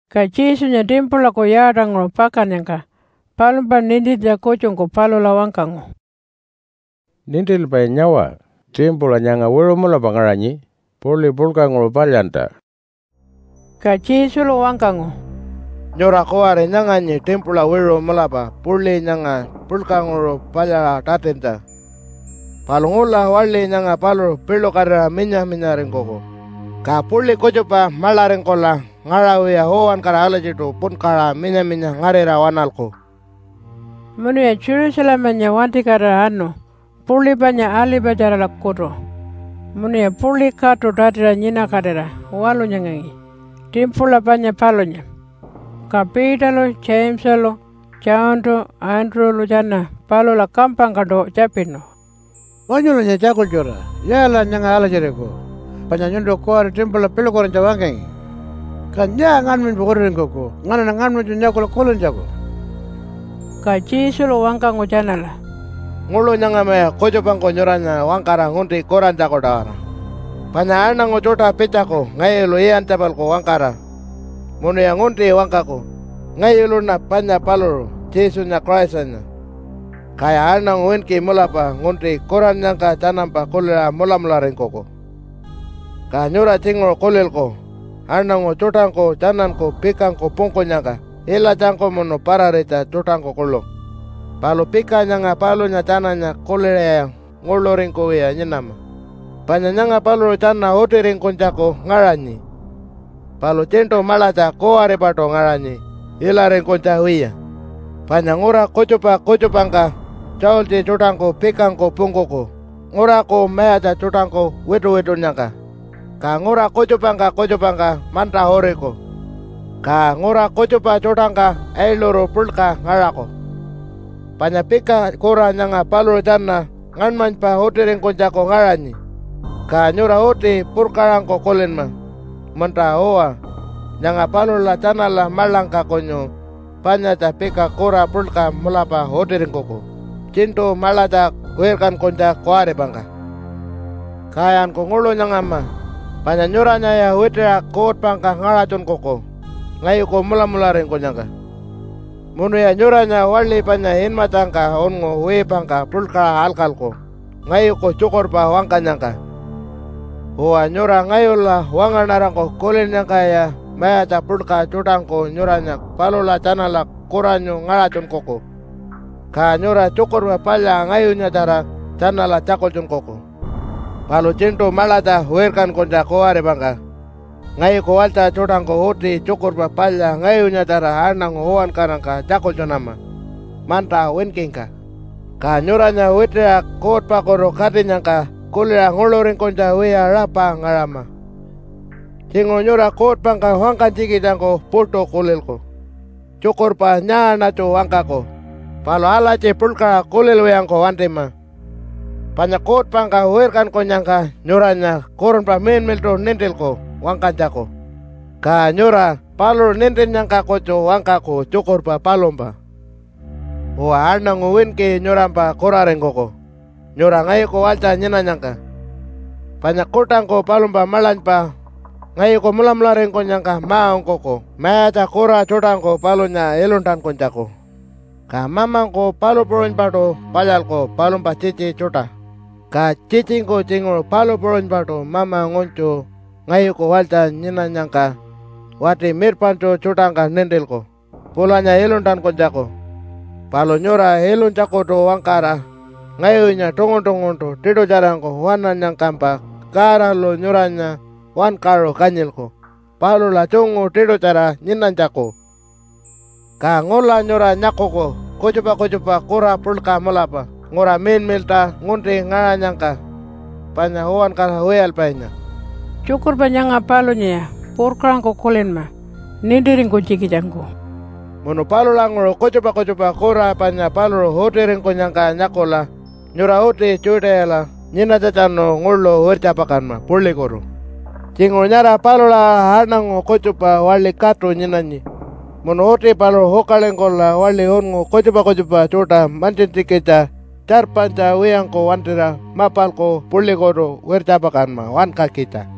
Ka Jesunya timpulaku yaatanguṟu pakannyangka palumpa nintintja kutjungku palula wangkangu, “Nintilpai, nyawa! Timpula nyanga wiṟu mulapa ngaṟanyi puḻi puḻkanguṟu palyantja.” Ka Jesulu wangkangu, “Nyura kuwari nyanganyi timpula wiṟu mulapa puḻi nyanga puḻkanguṟu palyaṟa tatintja. Palu ngula waḻi nyanga paluṟu piḻukatira minya-minyaringkuku. Ka puḻi kutjupa maḻaringkula ngaṟawiya uwankara alatjiṯu punkaṟa minya-minya ngarira waṉalku.” Munuya Jerusalemanya wantikatira anu puḻi panya Alipatjaralakutu munuya puḻi katu tatiṟa nyinakatira walunyangangi timpula panya palunya. Ka Peterlu Jamesalu, Johntu, Andrew-lu tjana palula kampangkaṯu tjapinu, “Wanyulanya tjakultjura! Yaalaṟa nyanga alatjiriku panya nyuntu kuwari timpula piḻukatinytja wangkangi? Ka nyaa ngaṉmanypa utiringkuku nganaṉa ngaṉmanytju nyakula kulintjaku?” Ka Jesulu wangkangu tjanala, “Nguḻu nyangamaya kutjupangku nyuranya wangkara ngunti kurantjaku-tawara. Panya aṉangu tjuṯa pitjaku ngayulu iyantja-palku wangkara munuya ngunti wangkaku, ‘Ngayuluṉa panya paluṟu, Jesunya Christanya.’ Kaya aṉangu winki mulapa ngunti kurannyangka tjanampa kuliṟa mulamularingkuku. “Ka nyura tjinguṟu kulilku aṉangu tjuṯangku tjananku pikangku pungkunyangka ilatjangku munu pararitja tjuṯangku kuḻu. Palu pika nyanga palunya tjananya kuliṟaya nguḻuringkuwiya nyinama, panya nyanga paluṟu tjana utiringkunytjaku ngaṟanyi, palu tjiṉṯu maḻatja kuwaripaṯu ngaṟanyi ilaringkunytja wiya. Panya ngura kutjupa kutjupangka tjaultji tjuṯangku pikangku pungkuku nguraku mayatja tjuṯangku wituwitunnyangka. Ka ngura kutjupangka kutjupangka manta uriku, ka ngura kutjupa tjuṯangka ailuru puḻka ngaṟaku. Panya pika kura nyanga paluṟu tjana ngaṉmanypa utiringkunytjaku ngaṟanyi, ka nyura uti purkaṟangku kulinma, ‘Munta-uwa, nyanga palula tjanala maḻangka kunyu panyatja pika kura puḻka mulapa utiringkuku tjiṉṯu maḻatja wirkankunytja kuwaripangka.’ “Kayanku nguḻu nyangama, panya nyuranyaya witiṟa kuutpangka ngaṟatjunkuku ngayuku mulamularingkunyangka, munuya nyuranya waḻi panya inmatjangka unngu wiipangka puḻkaṟa alkalku ngayuku tjukurpa wangkanyangka. Uwa, nyura ngayula wangaṉarangku kulinnyangkaya mayatja puḻka tjuṯangku nyuranya palula tjanala kuranyu ngaṟatjunkuku, ka nyura Tjukurpa Palya ngayunyatjara tjanala tjakultjunkuku. Palu tjiṉṯu maḻatja wirkankunytja kuwaripangka ngayuku walytja tjuṯangku uti Tjukurpa Palya ngayunyatjara aṉangu uwankarangka tjakultjunama manta winkingka. Ka nyuranya witiṟa kuutpakutu katinyangka kuliṟa nguḻuringkunytja wiya rapa ngaṟama. Tjinguṟu nyura kuutpangka wangkanytjikitjangku puṯu kulilku, ‘Tjukurpa nyaaṉatju wangkaku?’ Palu alatji puḻkaṟa kulilwiyangku wantima, panya kuutpangka wirkankunyangka nyuranya Kurunpa Miḻmiḻṯu nintilku wangkanytjaku. Ka nyura paluṟu nintinnyangka kutju wangkaku tjukurpa palumpa. “Uwa, aṉangu winki nyurampa kuraringkuku nyura ngayuku walytja nyinanyangka. Panya kuṯangku palumpa maḻanypa ngayuku mulamularingkunyangka ma-ungkuku mayatja kura tjuṯangku palunya iluntankunytjaku. Ka mamangku palu puṟunypaṯu palyalku palumpa tjitji tjuṯa. Ka tjitjingku tjinguṟu palu puṟunypaṯu mama ngunytju ngayuku walytja nyinanyangka, wati mirpaṉtju tjuṯangka nintilku pulanya iluntankunytjaku. Palu nyura ilunytjakutu-wangkara ngayunya tungun-tunguntu tiṯutjarangku waṉannyangkampa, Godalu nyuranya wankaṟu kanyilku palula tjungu tiṯutjara nyinanytjaku. “Ka ngula nyura nyakuku kutjupa kutjupa kura puḻka mulapa ngura miḻmiḻṯa ngunti ngaṟanyangka panya uwankara wiyalpainya.” (Tjukurpa nyanga palunyaya purkaṟangku kulinma nintiringkunytjikitjangku.) “Munu palulanguṟu kutjupa kutjupa kura panya paluṟu utiringkunyangka nyakula nyura uti Judeala nyinanytjatjanu nguḻu wirtjapakanma puḻikutu. Tjinguṟu nyara palula aṟa aṉangu kutjupa waḻi katu nyinanyi, munu uti paluṟu ukalingkula waḻi unngu kutjupa kutjupa tjuṯa mantjintjikitja, tjarpanytja wiyangku wantira mapalku puḻikutu wirtjapakanma wankakitja.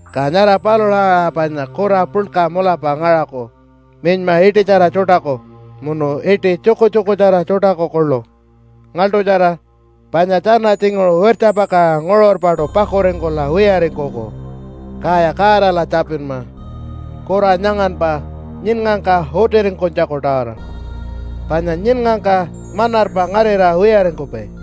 Ka nyara palula aṟa panya kura puḻka mulapa ngaṟaku minyma iṯitjara tjuṯaku munu iṯi tjukutjukutjara tjuṯaku kuḻu. Ngaḻṯutjara! Panya tjana tjinguṟu wirtjapakaṟa nguṟurpaṯu pakuringkula wiyaringkuku. Kaya Godala tjapinma kura nyanganpa nyiṉngangka utiringkunytjaku-tawara, panya nyiṉngangka manarpa ngarira wiyaringkupai.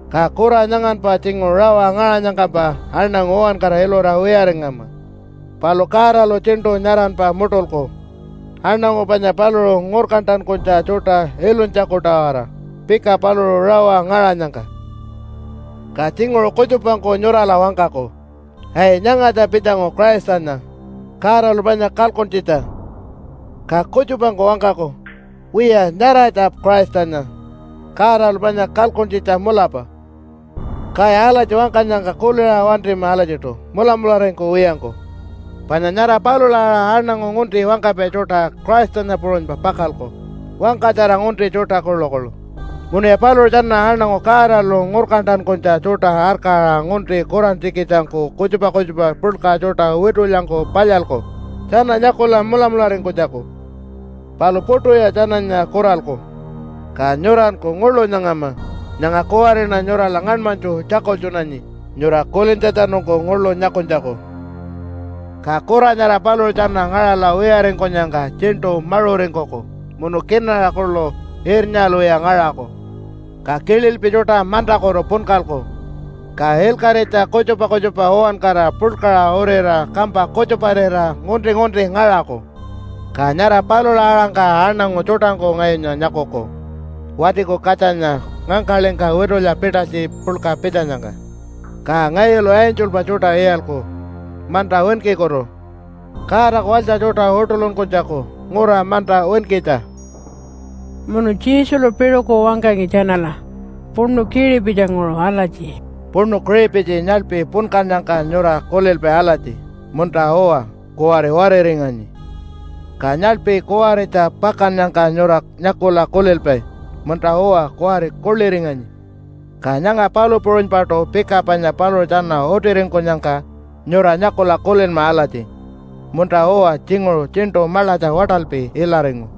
Ka kura nyanganpa tjinguṟu rawa ngaṟanyangkampa aṉangu uwankara ilura wiyaringama. Palu Godalu tjiṉṯu nyaranpa muṯulku, aṉangu panya paluṟu ngurkantankunytja tjuṯa ilunytjaku-tawara, pika paluṟu rawa ngaṟanyangka. “Ka tjinguṟu kutjupangku nyurala wangkaku, ‘Ai nyangatja pitjangu Christanya, Godalu panya kalkuntjitja.’ Ka kutjupangku wangkaku, ‘Wiya, nyaratja Christanya, Godalu panya kalkuntjitja mulapa.’ Kaya alatji wangkanyangka kuliṟa wantima alatjiṯu mulamularingkuwiyangku. Panya nyara palula aṟa aṉangu ngunti wangkapai tjuṯa Christanya puṟunypa pakalku, wangkatjara ngunti tjuṯa kuḻukuḻu, munuya paluṟu tjana aṉangu Godalu ngurkantankunytja tjuṯa arkaṟa ngunti kurantjikitjangku, kutjupa kutjupa puḻka tjuṯa witulyangku palyalku, tjana nyakula mulamularingkunytjaku, palu puṯuya tjananya kuralku. Ka nyuranku nguḻu nyangama. Nyanga kuwariṉa nyurala ngaṉmanytju tjakultjunanyi nyura kulintjatjanungku nguḻu nyakunytjaku. “Ka kura nyara paluṟu tjana ngaṟala wiyaringkunyangka tjiṉṯu maṟuringkuku munu kinaṟa kuḻu irnyalwiya ngaṟaku. Ka kililpi tjuṯa mantakutu punkalku, ka ilkaṟitja kutjupa kutjupa uwankara puḻkaṟa urira kampa kutjuparira ngunti-ngunti ngaṟaku. Ka nyara palula aṟangka aṉangu tjuṯangku ngayunya nyakuku Watiku Katjanya ngangkaḻingka witulya pitalytji puḻka pitjanyangka. Ka ngayulu angelpa tjuṯa iyalku manta winkikutu Godaku walytja tjuṯa uṯuḻunkunytjaku ngura manta winkitja.” Munu Jesulu piṟuku wangkangi tjanala puṉu kiṟipitjinguṟu alatji, “Puṉu kiṟipitji nyaḻpi punkannyangka nyura kulilpai alatji, ‘Munta-uwa, kuwari wariringanyi.’ Ka nyaḻpi kuwaritja pakannyangka nyura nyakula kulilpai, ‘Munta-uwa, kuwari kuḻiringanyi.’ Ka nyanga palu puṟunypaṯu pika panya paluṟu tjana utiringkunyangka nyura nyakula kulinma alatji, ‘Munta-uwa tjinguṟu tjiṉṯu maḻatja waṯalpi ilaringu.’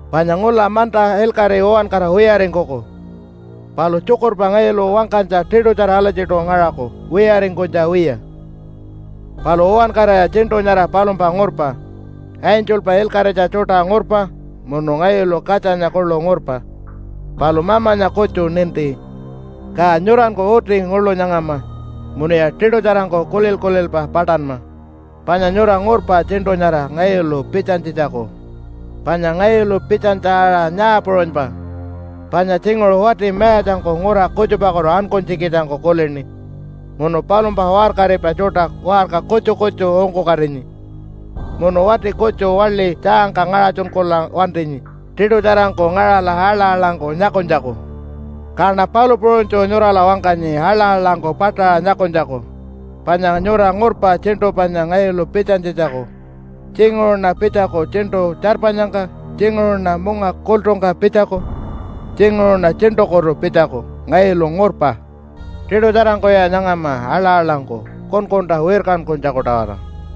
Panya ngula manta ilkaṟi uwankara wiyaringkuku, palu tjukurpa ngayulu wangkanytja tiṯutjara alatjiṯu ngaṟaku wiyaringkunytja wiya. “Palu uwankaraya tjiṉṯu nyara palumpa ngurpa. Angelpa ilkaṟitja tjuṯa ngurpa munu ngayulu Katjanya kuḻu ngurpa, palu Mamanya kutju ninti. Ka nyuranku uti nguḻu nyangama munuya tiṯutjarangku kulil-kulilpa paṯanma, panya nyura ngurpa tjiṉṯu nyara ngayulu pitjanytjitjaku. Panya ngayulu pitjanytja aṟa nyaa puṟunypa, panya tjinguṟu wati mayatjangku ngura kutjupakutu ankunytjikitjangku kulini munu palumpa waṟkaripai tjuṯa waṟka kutju kutju ungkukatinyi munu wati kutju waḻi tjaangka ngaṟatjunkula wantinyi tiṯutjarangku ngaṟala aḻa-aḻangku nyakunytjaku. Kaṉa palu puṟunytju nyurala wangkanyi aḻa-aḻangku paṯaṟa nyakunytjaku panya nyura ngurpa tjiṉṯu panya ngayulu pitjanytjitjaku. Tjinguṟuṉa pitjaku tjiṉṯu tjarpanyangka, tjinguṟuṉa munga kultungka pitjaku, tjinguṟuṉa tjiṉṯukutu pitjaku. Ngayulu ngurpa. Tiṯutjarangkuya nyangama aḻa-aḻangku kunkunta wirkankunytjaku-tawara.